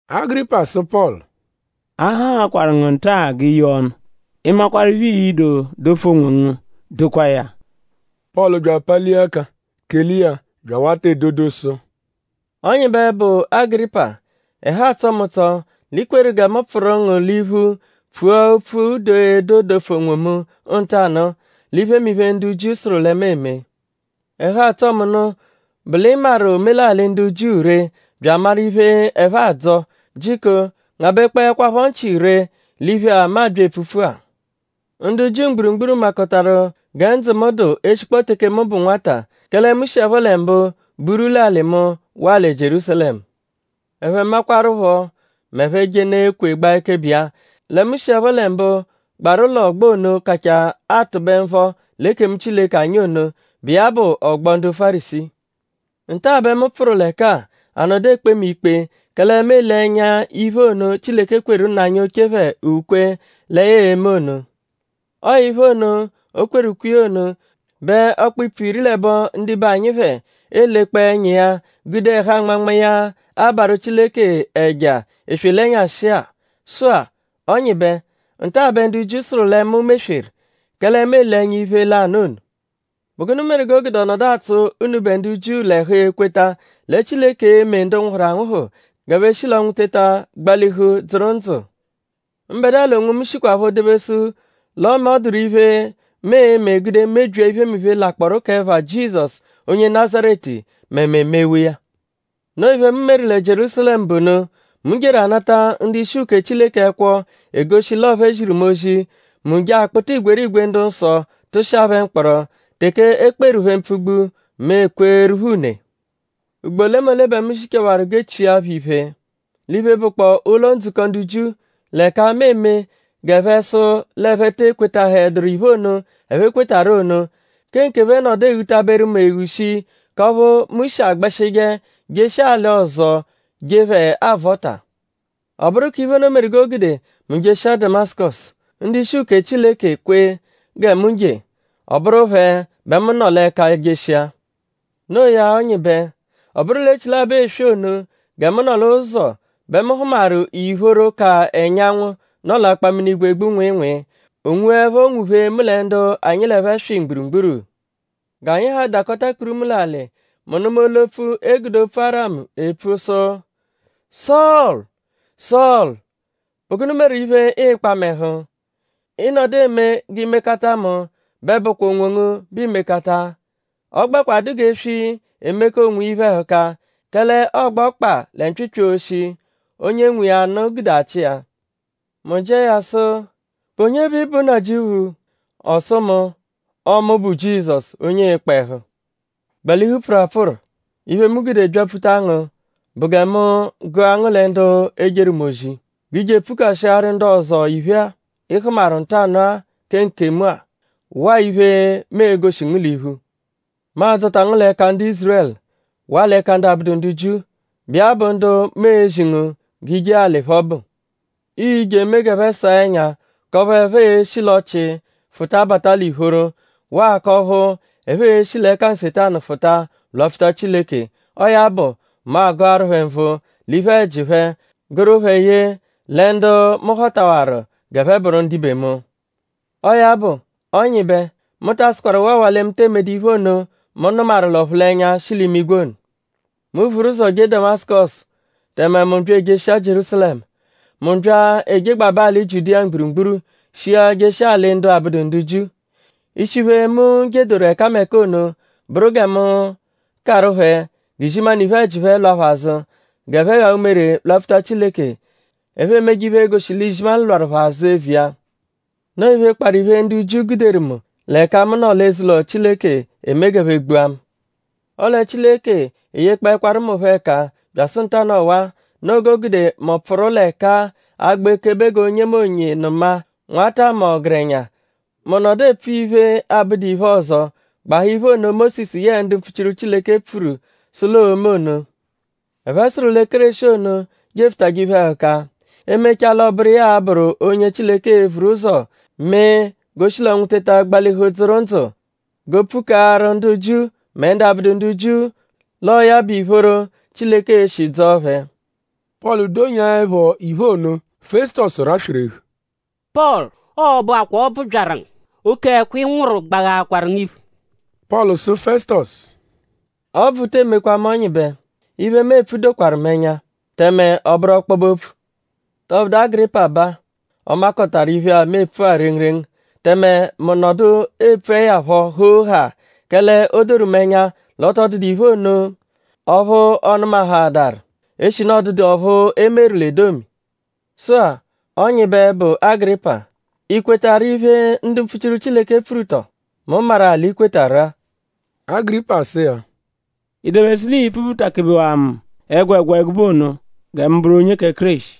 Agịripa sụ Pọlu: “A haakwaru ngu nta-a g'i yee ọnu. Ị -makwarụ iphe, ii-do dofu onwongu dokwaa ya.” Pọlu bya apalia ẹka kele iya bya awata edodo sụ: “Ọnyibe, bụ Agịripa; ẹhu atsọ mu l'i kweru gẹ mu pfụru ngu l'iphu pfua opfu; doo edo dofu onwomu ntanụ-a l'iphemiphe, ndu Jiu sụru lẹ mu eme. Ẹhu, atsọ mu nụ bụ l'ị maru omelalị ndu Jiu ree bya amaru iphe, ẹphe adzọ. Jiko ngabẹkpoekwapho nchị ree l'iphe-a, mu abya epfupfu-a. “Ndu Jiu mgburugburu makọtaru gẹ ndzụ mu dụ eshikpọo teke mu bụ nwata; kẹle mu shiẹpho lẹ mbụ buru l'alị mu waa lẹ Jierúsalẹmu. Ẹphe makwaruphọ; m'ẹphe -jenụ ekwe gbaa ekebe iya; lẹ mu shiẹpho lẹ mbụ gbaru l'ọgbo ono, kachaa atụbe nvọ l'ekemu Chileke anyi ono, bụ iya bụ ọgbo ndu Fárisii. Nta-a bẹ mu pfụru l'ẹka-a; a nọdu ekpe mu ikpe; kẹle mu ele ẹnya iphe ono, Chileke kweru nna anyi oche phẹ ukwe lẹ ya e-me ono. Ọo iphe ono, o kweru ukwe iya ono bẹ ọkpa-ipfu iri l'ẹbo ndibe anyi phẹ elekpọo ẹnya iya gude ẹhu anmanma iya abarụ Chileke ẹja eswe l'ẹnyashi-a. Sụ-a; Ọnyibe; nta-a bẹ ndu Jiu sụru lẹ mu mesweru; kẹle mu ele ẹnya iphe lanụ ono. ?Bụ gụnu meru g'o gude ọ nọdu atsụ unubẹ ndu Jiu l'ẹhu ekweta lẹ Chileke e-me ndu nwụhuru anwụhu g'ẹphe shi l'ọnwu teta gbalihu dzụru ndzụ? “Mbẹdua l'onwomu shikwaphọ dobesu l'ọme ọ dụru iphe, mu e-me gude mebyia iphemiphe, lakpọoru k'ẹpha Jizọsu onye Nazaretu mẹ mu emewaa iya. Noo iphe, mu meru lẹ Jierúsalẹmu bụ ono. Mu jeru anata ndu-ishi uke Chileke ẹkwo, egoshi l'ọo phẹ ziru mu ozi. Mu je akpụta igwerigwe ndu-nsọ tụshia phẹ mkpọro. Teke e kperu phẹ mpfugbu; mu ekweeru phẹ une. Ugbo olemole bẹ mu zichawaru g'e chia phẹ iphe l'iphe, bụkpoo ụlo-ndzukọ ndu Jiu; l'ẹka mu eme g'ẹphe sụ l'ẹphe te ekwetahẹduru iphe ono, ẹphe kwetarụ ono. Kẹ nkephẹ nọdu eghutaberu mu eghu shii k'ọphu mu shi agbẹshije jeshia alị ọzo je phẹ avọta.” “Ọ bụru k'iphe ono meru g'o gude mu jeshia Damasụkosu. Ndu-ishi uke Chileke kwe gẹ mu je; ọ bụru phẹ bẹ mu nọ l'ẹka jeshia. Noo ya Ọnyibe; ọ bụru l'echilabọ eswe ono gẹ mu nọ l'ụzo bẹ mu hụmaru ìphóró, ka ẹnyanwu, nọ l'akpaminigwe egbu nwịinwii. O nwuẹpho nwuphee mu lẹ ndu anyi l'ẹphe swị mgburugburu. G'anyi ha dakọta kpurumu l'alị. Mu nụma olu-opfu, e gude opfu Aramu epfu sụ: ‘Sọlu! Sọlu!’ ‘?Bụ gụnu meru iphe, ịikpa mu ẹhu? Ị -nọdu eme g'i mekata mu bẹ ọ bụkwa onwongu bẹ iimekata. Ọ gbẹkwa dụ g'eswi, emeka onwiya iphe-ẹhuka; kẹle ọogba ọkpa lẹ mpyịpyi oshi, onye nwe iya nụ gude achị iya.’ Mu jịa ya sụ: ‘?Bụ onye bẹ ị bụ Nnajịuphu?’ Ọ sụ mu: ‘Ọo mu bụ Jizọsu; onye ịikpa ẹhu.’ ‘Gbalihu pfụru apfụru. Iphe, mu gude byapfuta ngu bụ gẹ mu gụa ngu lẹ ndu ejeru mu ozi. G'i je epfukashiaru ndu ọzo iphe-a, ị hụmaru ntanụ-a kẹ nkemu-a; waa iphe, mu e-goshi ngu l'iphu.’ Mu a-dzọta ngu l'ẹka ndu Ízurẹlu waa l'ẹka ndu abụdu ndu Jiu, bụ iya bụ ndu mu ezi ngu g'i je alị phẹ ọbu. ‘Ii-je emee g'ẹphe saa ẹnya k'ọphu ẹphe e-shi l'ọchii fụta bata l'ìphóró; waa k'ọphu ẹphe e-shi l'ẹka Nsetanu fụta lwapfuta Chileke. Ọo ya bụ; mu agụaru phẹ nvụ l'iphe-ẹji phẹ gụru phẹ ye lẹ ndu mu họtawaru g'ẹphe bụru ndibe mu.’ “Ọo ya bụ; Ọnyibe; mu ta asụkwaru waawaa lẹ mu tee medu iphe ono, mu nụmaru l'ọphulenya, shi l'imigwe ono. Mu vuru ụzo jee Damasụkosu; tẹme mu bya ejeshia Jierúsalẹmu. Mu bya ejegbabẹ alị Jiudiya mgburugburu shia jeshia alị ndu abụdu ndu Jiu. Ishi iphe, mu jedoru ẹkameka ono bụru gẹ mu karụ phẹ g'izimanụ iphe-ẹji phẹ lwa phẹ azụ g'ẹphe ghaa umere lwapfuta Chileke; ẹphe emeje iphe, e-goshi l'izimanụ lwarụ phẹ azụ eviya. Noo iphe, kparụ iphe, ndu Jiu guderu mu l'ẹka mu nọ l'eze-ụlo Chileke eme g'ẹphe gbua mu. Ọle Chileke eyekpọekwaru mu phọ ẹka byasụ ntanụ ọwa. Noo g'o gude mu pfụru l'ẹka-a agba ekebe g'onyemonye nụma; nwata mẹ ọgerenya. Mu nọdu epfu iphe, abụdu iphe ọzo gbahaa iphe ono, Mósisu yẹe ndu mpfuchiru Chileke pfuru sụ l'oo-me ono. Ẹphe sụru lẹ Kéreshi ono, jefụtaje iphe-ẹhuka. E -mechaa l'ọ bụru iya a-bụru onye Chileke e-vuru ụzo mee g'o shi l'ọnwu teta gbalihu dzụru ndzụ; g'o pfukaaru ndu Jiu mẹ ndu abụdu ndu Jiu l'ọo ya bụ ìphóró, Chileke e-shi dzọo phẹ.” Pọlu donyaẹpho iphe ono; Fẹsutosu raswerehu: “Pọlu! Ọo bụakwaa ọbvu byaru ngu! Oke ẹkwo, ị nwụru gbaghaakwaru ngu iphu!” Pọlu sụ Fẹsutosu: “Ọbvu te emekwa mu Ọnyibe. Iphe, mu epfu dokwaru ẹnya; tẹme ọ bụru ọkpobe-opfu.” ?Tọbudu Agịripa baa? Ọ makọtaru iphe-a, mu epfu-a rengurengu; tẹme mu nọdu epfuẹ ya phọ hoo-haa; kẹle o doru mu ẹnya l'ọ tọ dụdu iphe ono ọphu ọ nụmahaadaru; eshinu ọ dụdu ọphu e meru l'edomi. Sụ-a; Ọnyibe, bụ Agịripa;?I kwetarụ iphe, ndu mpfuchiru Chileke pfuru tọ? Mu maru-a l'i kwetarụ-a! Agịripa sụ iya: “?I dobesu l'ii-pfubutakebewaa mu ẹgwegwa ẹgube ono gẹ mu bụru onye kẹ Kéreshi?”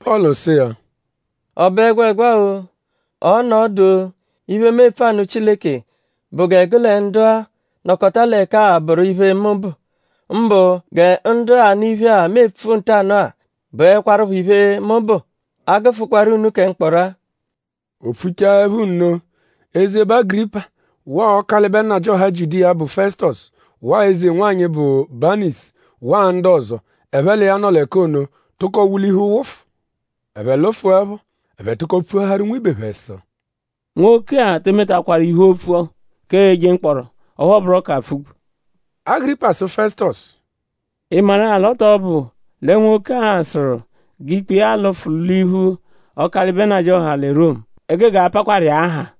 Pọlu sụ iya: “?Ọ bụ ẹgwegwa-o;?ọo-nọ ọdu-o; iphe, mu epfu anụ Chileke bụ gẹ gụ lẹ ndu-a, nọkota l'ẹka-a bụru iphe, mu bụ; mbụ gẹ ndu-a, anụ iphe-a, mu epfu ntanụ-a bụekwarupho iphe, mu bụ; a -gụfukwaru unu kẹ mkpọro-a.” O pfuchaẹpho nno; eze, bụ Agịripa waa Ọkalibe nnajịoha Jiudiya, bụ Fẹsutosu waa eze-nwanyị, bụ Baniisu waa ndu ọzo, ẹphe l'iya nọ l'ẹka ono tụko wulihu wụfu. Ẹphe lụfuepho; ẹphe tụko pfuaharu nwibe phẹ sụ: “Nwoke-a te emetakwaru iphe opfu k'eje mkpọro; ọphu ọ bụro k'apfugbu.” Agịripa sụ Fẹsutosu: “?Ị maru-a l'ọ tọ bụ lẹ nwoke-a sụru g'ikpe iya lụfu l'iphu Ọkalibe nnajịoha lẹ Romu; e gege apakwaru iya-a haa.”